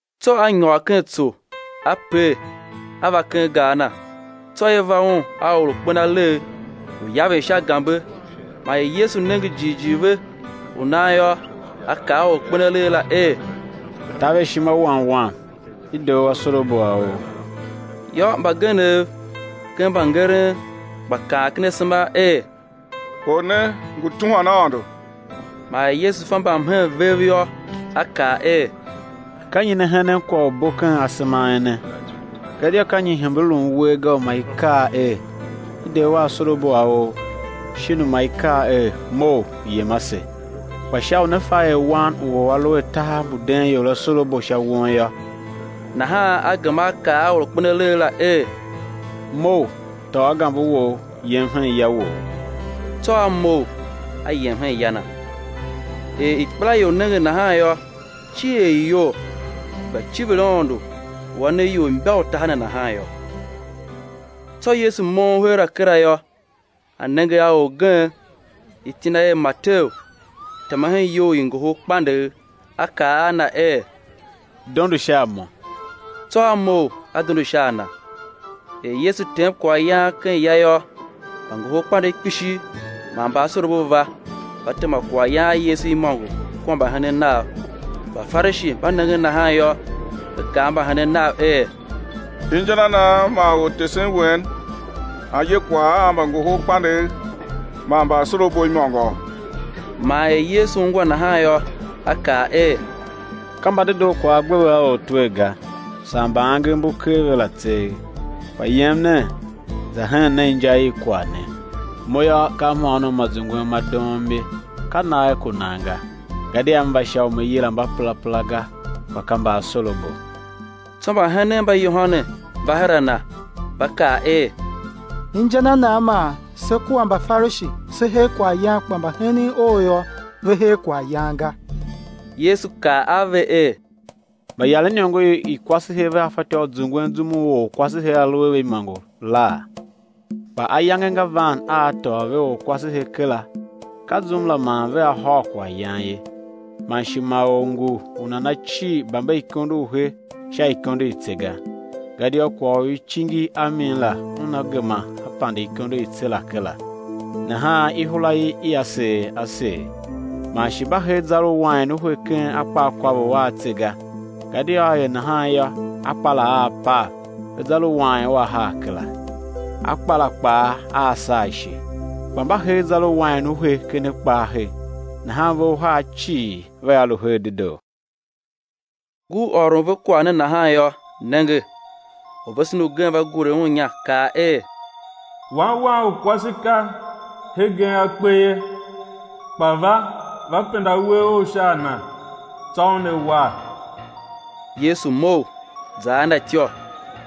Tsô A nyôr ken tso, A per, A va ken gar Na. Tsô i va Un a or u kpen alegh, lu yaven sha gambe. Man er Yesu nenge jighjigh ve u nan yô, A kaa a or u kpen alegh la er: Taver ishima wan Wam, i de u asorabo a ou. Yô, mbagenev ken mbangeren gba kaan ken asema er: Or ne ngu tuhwan Aôndo. Man er Yesu fa mbamhen vev yô, A kaa er: Ka nyi ne henen kwagh u bo ken asema a ene? Gadia ka nyi i hembe lun uwer ga u ma i kaa er: I de u asorabo a ou; shin u ma i kaa er: Mough yem ase? Kpa sha u né fa er Wan u or A lu a tahav mbu den ior asorabo sha won yô, nahan A gema a kaa a or u kpen alegh la er: Mough, tôô gambe wou, yem hen ya wou. Tsô a mough, a yem hen ya na. Er ikpelaior nenge nahan yô, cier i iyol, i gba civir Aôndo u A ne ior imbautaha ne nahan yô. Tsô Yesu moughon heera kera yô, A nenge a orgen, iti na er Mateu, tema hen iyou i ngohol kpandegh; A kaa a na er: Dondo sha a Mo. Tsô a mough a dondo sha a Na. Er Yesu tem kwaghyan ken ya yô, mbangoholkpandegh kpishi man mbaasorabo va, va tema kwaghyan a Yesu imôngo kua mbahenen Nav. Mbafarishi mba nengen nahan yô, ve kaa a mbahenen Nav er: Inja na nan man Ortesen wen a ye kwagh a mbangoholkpandegh man mbaasorabo imôngo? Man er Yesu ungwa nahan yô, A kaa er: Ka mbadedoo kwagh a gbe ve a ortwer ga, saa mba angev mbu ker ve la tseegh. Kpa yem nen za hen nen inja i kwagh ne: Mo yô, ka mhôônom ma zungwen ma doom ye, ka nagh ku nan ga; gadia M va sha u Me yilan mbaperapera ga, kpa ka mbaasorabo. Tsô mbahenen mba Yohane va her a Na, va kaa er: Inja na nan man se kua Mbafarishi, se her kwaghyan kpa mbahenen Ou yô, ve her kwaghyan ga? Yesu kaa a ve er: Mbayaren iniongo i kwasehe vea fatyô, u zungwen zum u orkwasehe a lu a ve imôngo laa? Kpa ayange nga van a á tôô ve orkwasehe kera; ka zum la man vea hôr kwaghyan ye. Man shi ma or ngu u nana cir bamberikondo u he sha ikondo i tse ga, gadia kwagh u i cingi i a mi la una gema a pande ikondo i tse la kera; nahan ihura ia seer a seer. Man shi mba hee zar u wain u he ken akpaakôvough a tse ga, gadia á er nahan yô, akpa la aa pav, zar u wain ua haa kera, akpa la kpaa aa saa ishe. Kpa mba hee zar u wain u he ken akpa a he, nahan ve uhar cii vea lu her dedoo. Ngur ôron ve kwagh ne nahan yô, nenge, orvesen ugen va gure Un inya, kaa er: Wan wam u kwase ka hegen a kpe ye, kpa va, va penda uwegh Ough sha a na, tsô una war. Yesu mough, za a na ityô,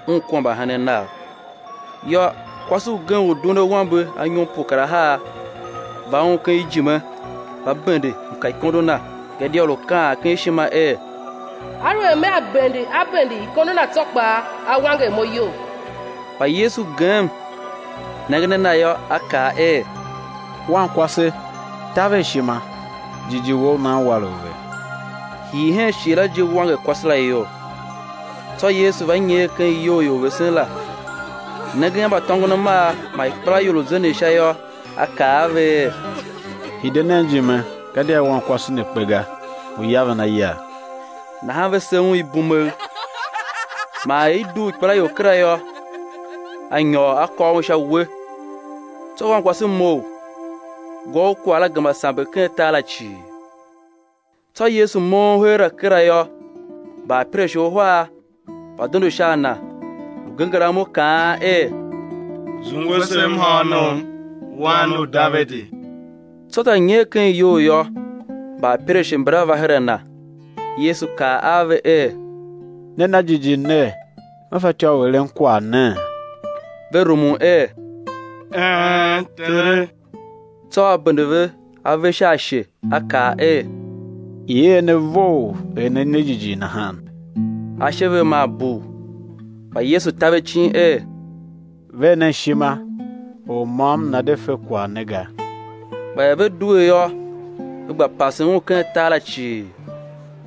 Un kua mbahenen Nav. Yô, kwase ugen u duen awambe anyom pue kar ahar, va Un ken ijime, va bende mkaikondo Na; gadia lu kaan ken ishima er: Aluer mea bende a bende ikondo Na tsô kpaa, á wanger mo iyol. Kpa Yesu gem, nengen a na yô, A kaa er: Wankwase, taver ishima; jighjigh wou u nan war u ve. Hii hen shighe la je wanger kwase la iyol. Tsô Yesu va nyer ken iyou i orvesen la, nengen a mbatôngonamar man ikpelaior lu zenden sha yô, A kaa a ve er: Hide nen ijime, gadia wankwase ne kpe ga, ngu yaven a yav. Nahan ve se Un ibumegh. Man er i dugh ikpelaior kera yô, A nyôr A kôr un sha uwe; tsô wankwase mough. Gwa u kwagh la gema samber ken tar la cii. Tsô Yesu moughon heera kera yô, mbaapirashe uhar va dondo sha a Na, lu genger amo, kaan er: Zungwe se mhôônom, Wan u Davidi! Tsô za nyer ken iyou yô, mbaapirashe mbala va her a Na. Yesu kaa a ve er: Ne na jighjigh ner, Me fatyô u eren kwagh nee? Ve rumun er: Een, Tere! Tsô A bende ve ave sha ashe, A kaa er: I̱ er ne vough er ne ne jighjigh nahan. Ashe ve maa bugh. Kpa Yesu ta ve icin er: Ver nen ishima, or môm nana̱ de fe kwagh ne ga. Kpa er ve due yô, ve gba pasen Un ken tar la cii.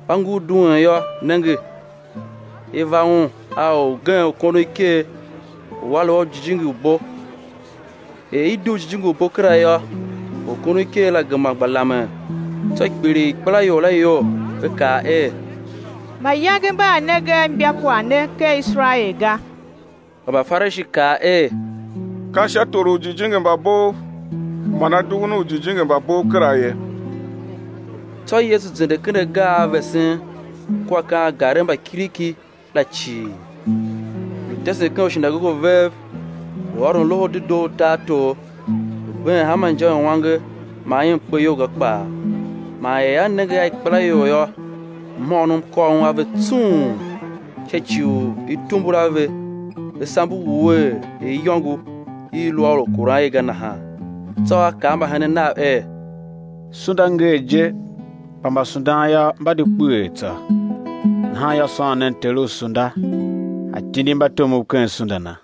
Mba ngur duen yô, nenge, i va Un a orgen u kondon iker u a lu a jijingi u bo. Er i dugh jijingi u bo kera yô, orkondoniker la gema gba lamen. Tsô kpiligh ikpelaior la iyol, ve kaa er: Mayange mba a nenge a imbakwagh ne ken Iserael ga. Kpa Mbafarishi kaa er: Ka sha tor u ujijingi mba bov man A dughun ujijingi mba bov kera ye. Tsô Yesu zende ken agar a vesen kua ken angarev mba kiriki la cii, lu tesen ken ushinagoge vev, lu ôron Loho u Dedoo u tartor, lu been hanma inja i uange man i mkpeyolga kpaa. Man er A nenge a ikpelaior yô, mhôônom kôr Un a ve tsung, sha ci u i tumbul a ve, ve sambe wuee er iyôngo i i lu a orkuran i ga nahan. Tsô A kaa a mbahenen Nav er: Sunda ngee je, kpa mbasundan yô, mba di kpeghee tsô. Nahan yô, sôn nen Ter u sunda, A tindi mbatomov ken sunda Na.